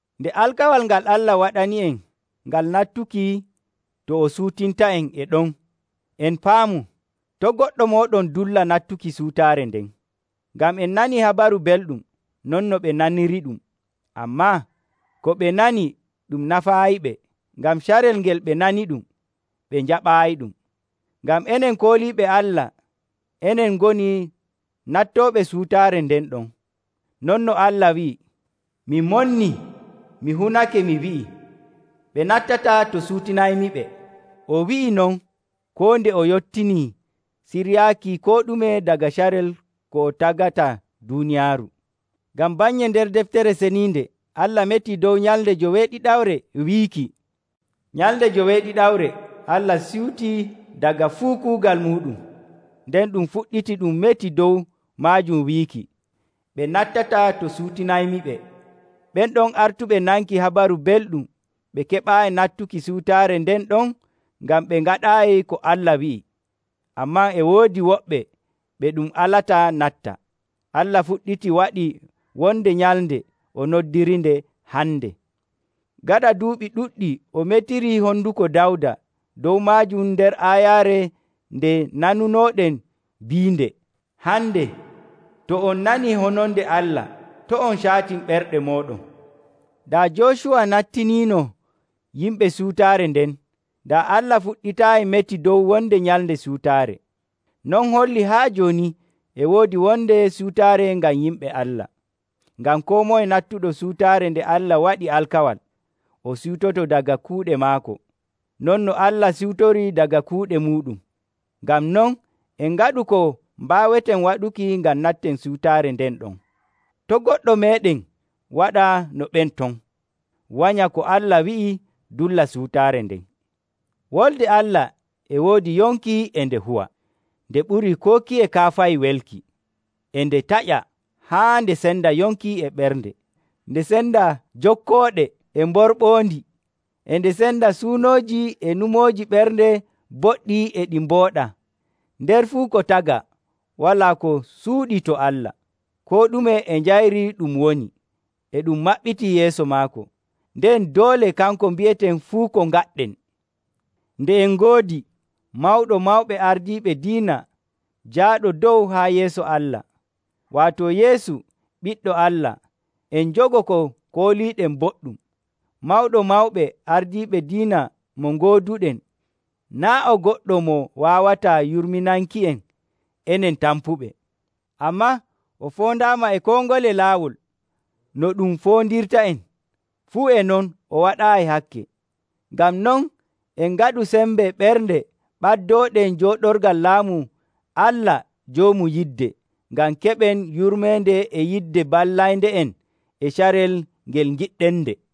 Nde alkawal ngal Allah waɗani'en ngal nattuki to o siwtinta'en e ɗon, en paamu, to' goɗɗo mooɗon dulla nattuki siwtaare nden. Ngam en nanii Habaru Belɗum, non no ɓe naniriɗum. Ammaa ko ɓe nani ɗum nafaayiɓe, ngam carel ngel ɓe naniɗum, ɓe njaɓaayiɗum. Ngam enen kooliiɓe Allah enen ngoni nattooɓe siwtaare nden ɗon. Non no Allah wi'i, “Mi monnii mi hunake mi wi'i, ‘Ɓe nattataa to ciwtinaymiɓe!’” O wi'ii non koo nde o yottini siryaaki koo ɗume daga carel ko o tagata duuniyaaru. Ngam bannye nder Deftere Ceniinde Allah metii dow nyalnde joweeɗiɗawre wiiki, “Nyalnde joweeɗiɗawre Allah siwtii daga fuu kuugal muuɗum.” Nden ɗum fuɗɗitii ɗum metii dow maajum wiiki, “Ɓe nattataa to ciwtinaymiɓe.” Ɓen ɗon artuɓe nanki Habaru Belɗum ɓe keɓaayi nattuki siwtaare nden ɗon ngam ɓe ngaɗaayi ko Allah wi'i. Ammaa e woodi woɓɓe ɓe ɗum alata natta. Allah fuɗɗitii waɗii wonde nyalnde o noddirinde, “Hande.” Gaɗa duuɓi ɗuɗɗi o metirii honduko Dawda dow maajum nder aayaare nde nanunooɗen biinde, “Hande, to on nanii hononde Allah, to' on caatin ɓerɗe mooɗon.” Daa Joocuwa nattiniino yimɓe siwtaare nden, daa Allah fuɗɗitaayi meti dow wonde nyalnde siwtaare. Non hollii haa jooni e woodi wonde siwtaare ngam yimɓe Allah. Ngam koo moye nattuɗo siwtaare nde Allah waɗi alkawal, o siwtoto daga kuuɗe maako, non no Allah siwtorii daga kuuɗe muuɗum. Ngam non en ngaɗu ko mbaaweten waɗuki ngam natten siwtaare nden ɗon. To' goɗɗo meeɗen waɗa no ɓen ton, wanya ko Allah wi'i dulla siwtaare nden. Wolde Allah e woodi yonki e nde huwa, nde ɓurii koo kiye kaafahi welki. E nde taƴa haa nde senda yonki e ɓernde, nde senda jokkooɗe e mborɓoondi. E nde senda suunooji e nyumooji ɓernde boɗɗi e ɗi mbooɗaa. Nder fuu ko tagaa, walaa ko suuɗii to Allah. Koo ɗume e njayri ɗum woni, e ɗum maɓɓitii yeeso maako. Nden doole kanko mbi'eten fuu ko ngaɗɗen. Nde en ngoodi Mawɗo Mawɓe Ardiiɓe Diina jaaɗo dow haa yeeso Allah, waato Yeesu, Ɓiɗɗo Allah, en njogo ko kooliiɗen boɗɗum. Mawɗo Mawɓe Ardiiɓe Diina mo ngooduɗen naa' o goɗɗo mo waawataa yurminanki'en enen tampuɓe. Ammaa o foondaama e koo ngole laawol no ɗum foondirta'en, fuu e non o waɗaayi hakke. Ngam non, en ngaɗu sembe ɓernde ɓaddooɗen jooɗorgal laamu Allah Joomu Yidde, ngam keɓen yurmeende e yidde ballaynde'en e carel ngel ngiɗɗennde.